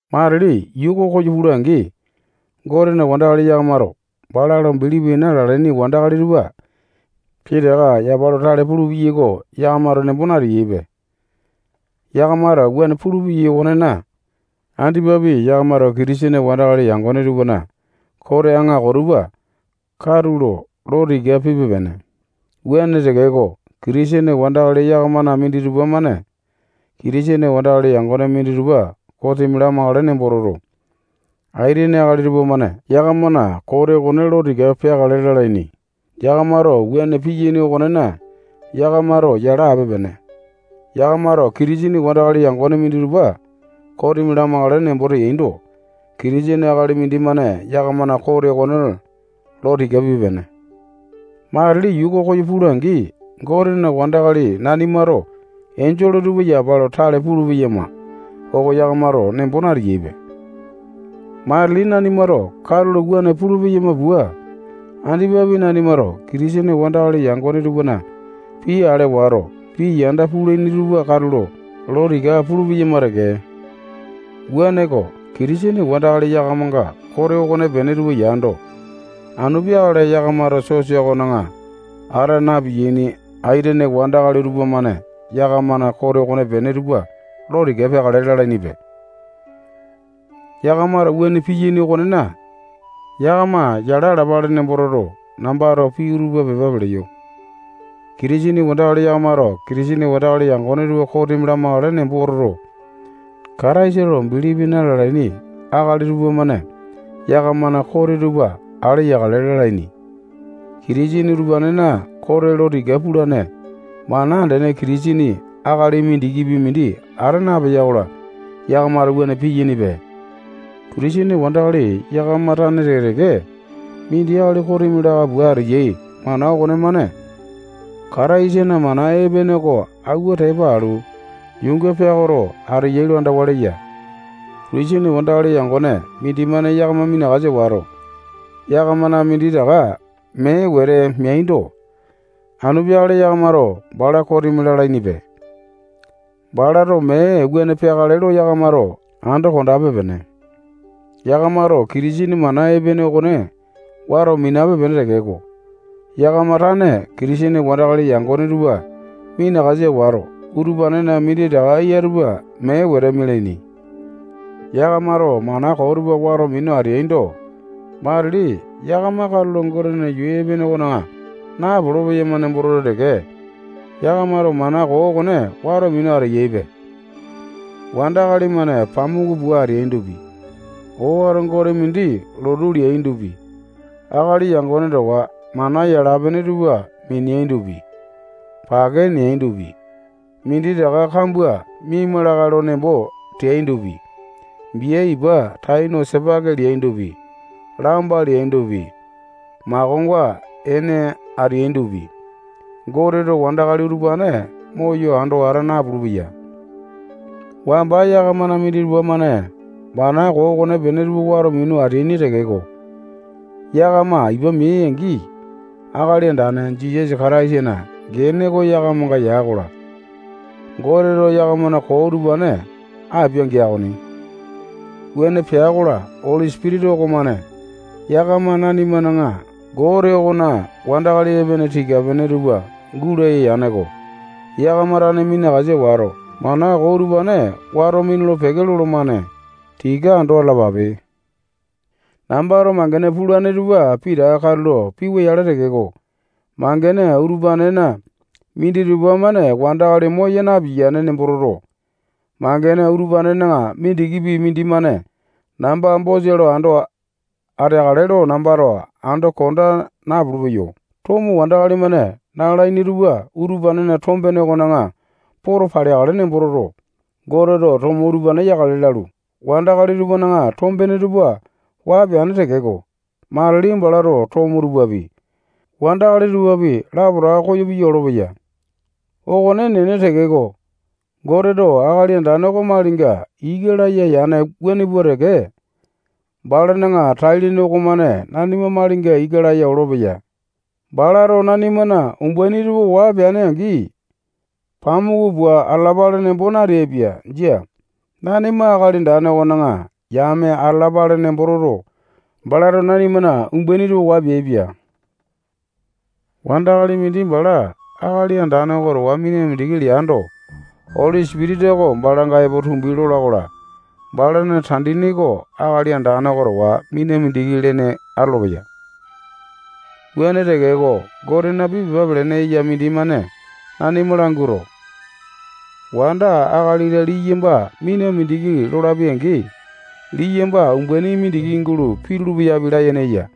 Matili yuu oko koyo pula-angi, Gotena wandakali yakamato bala lo bilipi na-lalaini wandakali tupa pitaka yapa lo tale pulupeyai oko yakamato nembo nateyaipe. Yakamato wuane pulupeyai okonena, andipapi yakamato Kitisene wandakali yangone tupana kote aŋako tupa katulo lo tika pipe-pene. Wuane tekeko, Kitisene wandakali yakamana minditupa-mane Kitisene wandakali yangone minditupa kosimi lamakale nembo toto, aitene akali tupamane yakamana kote okone lo tika peakale lalaini. Yakamato wuane piyaini okonena, yakamato yala ape-pene. Yakamato Kitisene wandakali yangone minditupa kosimi lamakale nembo teaindo, Kitisene akali mindimane yakamana kote okone lo tika pip-pene. Matili yuu oko koyo pula-angi, Gotena wandakali nanimato enjole tupa yapa lo tale pulu-peyama oko yakamato nembo nateyaipe. Matili nanimato katulo wuane pulu-peyama pua, andipapi nanimato Kitisene wandakali yangone tupana pii ale wato, pii yanda pulaini tupa katulo lo tika pulu-peyama teke. Wuaneko, Kitisene wandakali yakamanga kote okonepene tupa yando, anu peakale yakamato sosa okona ata na-piyaini aitene wandakali tupamane yakamana kote okonepene tupa lo tika peakale lalainipe. Yakamato wuane piyaini okonena, yakama yala alapale nembo toto, nambato pii utupa pepa peleyo. Kitisene wandakali yakamato Kitisene wandakali yangone tupa kosimi lamakale nembo toto, Kataisa lo bilipi na-lalaini akali tupamane yakamana kote tupa ale yakale lalaini. Kitisene utupanena kote lo tika pulane mana andene Kitisene akali mindikipi mindi ata napeya-kola, yakamato wuane piyainipe. Kitisene wandakali yakama tane teke-teke mindi akali kosimi laka pua ateyai mana okonemane Kataisana mana epene oko awua tepa alu, yuunga peakoto ateyai lo andawa leya. Kitisene wandakali yangone mindimane yakama minakasa wato, yakamana minditaka mee wete meando, anu peakale yakamato bala kosimi lalainipe. Balato mee wuane peakale lo yakamato ando konda ape-pene. Yakamato Kitisene mana epene okone wato minape-pene tekeko, yakama tane Kitisene wandakali yangone tupa minakasa wato, utupanena minditaka eya tupa mee wete mialaini. Yakamato mana koo tupa wato minu ateaindo, matili yakama katulo Gotena yuu epene okona napolo-peyama nembo toto teke, yakamato mana koo okone wato minu ateyaipe. Wandakali-mane pamuku pua ateaindopi, owato gote mindi lotu leaindopi, akali yangone towa mana yala-pene tupa mineaindopi, pake neaindopi, minditaka kambua miama lakae lo nembo teaindopi, bia ipa tai no sipaki leaindopi, lamba leaindopi, makonga ene ateaindopi, Goteto wandakali utupane moyo ando ata napulu-peya. Wamba yakamana minditupa-mane mana koo okonepene tupa wato minu ateaini tekeko, yakama ipa meai-angi, Akali Andane Jisasa Kataisana gene oko yakamanga ya-kola, Goteto yakamana koo utupane apia-gea okoni. Wuane pea-kola, Oli Sipitisa okomane yakama nanimana Gote okona wandakali epene tika-pene tupa gulaya yane-ko. Yakama tane minakasa wato, mana koo utupane wato minulu-peke lolomane. Tika ando atalapape. Nambato mangene pulane tupa pitaka katulo piwa-yale tekeko, mangene utupanena minditupa-mane wandakali moya na-piyaini nembo toto, mangene utupanena mindikipi mindimane namba bosa lo ando ateakale lo nambato ando konda napulu-peyo. Tomo wandakali-mane nalaini tupa utupanena tombene okona poto paleakale nembo toto, Goteto tomo utupane yakale lalu, wandakali tupana tombene tupa waa peane tekeko, matili balato tomo tupapi, wandakali tupapi, lapotaka koyo piya olopeya. Okone enene tekeko, Goteto Akali Andane oko malinga ika laya yane wuane pua teke balana tai-lene okomane nanima malinga ika laya olopeya. Balato nanimana umbaini tupa waa peane angi, pamuku pua atalapale nembo natea. Jia. Nanima Akali Andane okona yame atalapale nembo toto, balato nanimana umbaini tupa waa peane. Wandakali mindi bala Akali Andane oko towa mina mindiki leando, Oli Sipitisa oko balanga epo tumbi lola-kola, balana tandini oko Akali Andane oko towa mina mindiki lene atolopeya. Wuane tekeko, Gotena pii pepa pelene eya mindimane nanima languato, wanda, akali-la, liyamba mina mindiki lolapi-angi, liyamba umbaini mindiki gulo pitulu-peyapi layene eya.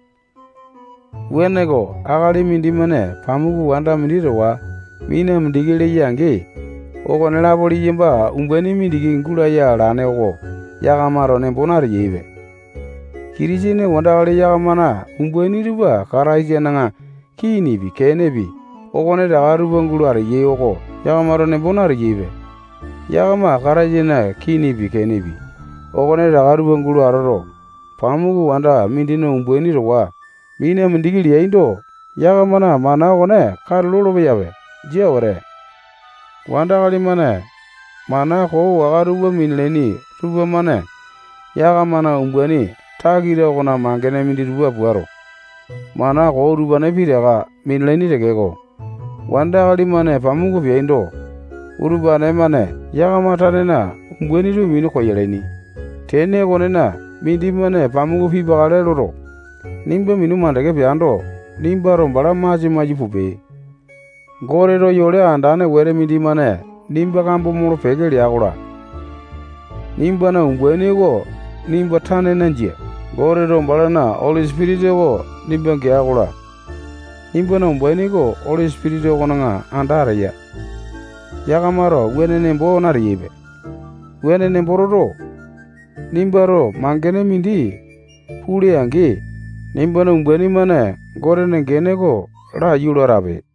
Wuaneko, akali mindimane pamuku wanda mindi towa mina mindiki leya-angi, okonelapo liyamba umbaini mindiki gulaya alane oko yakamato nembo nateyaipe. Kitisene wandakali yakamana umbaini tupa Kataisana kinipi, kenepi, okonetaka tupa gulo ateyai oko yakamato nembo nateyaipe. Yakama Kataisana kinipi, kenepi, okonetaka tupa gulo atoto, pamuku wanda mindina umbaini towa mina mindiki leaindo, yakamana mana okone katu lolo-peyape. Jia wete. Wandakali-mane mana koo waka tupa minalaini tupamane yakamana umbaini takita okona mangene minditupa puato, mana koo utupane pitaka minalaini tekeko, wandakali-mane pamuku peaindo, utupane-mane yakama tanena umbaini tupa minu koyalaini. Tene okonena, mindimane pamuku pipakale loto, nimba minu makande peando, nimbato bala masia maiyu pupe. Goteto yole andane wete mindimane nimba kambo molo-peke lea-kola, nimbana umbaini oko nimba tanena jia. Goteto balana Oli Sipitisa oko nimba gea-kola, nimbana umbaini oko Oli Sipitisa okona anda ateya. Yakamato wuane nembo nateyaipe. Wuane nembo toto, nimbato mangene mindi pule-angi, nimbana umbaini-mane Gotena gene oko laiyu lo atape.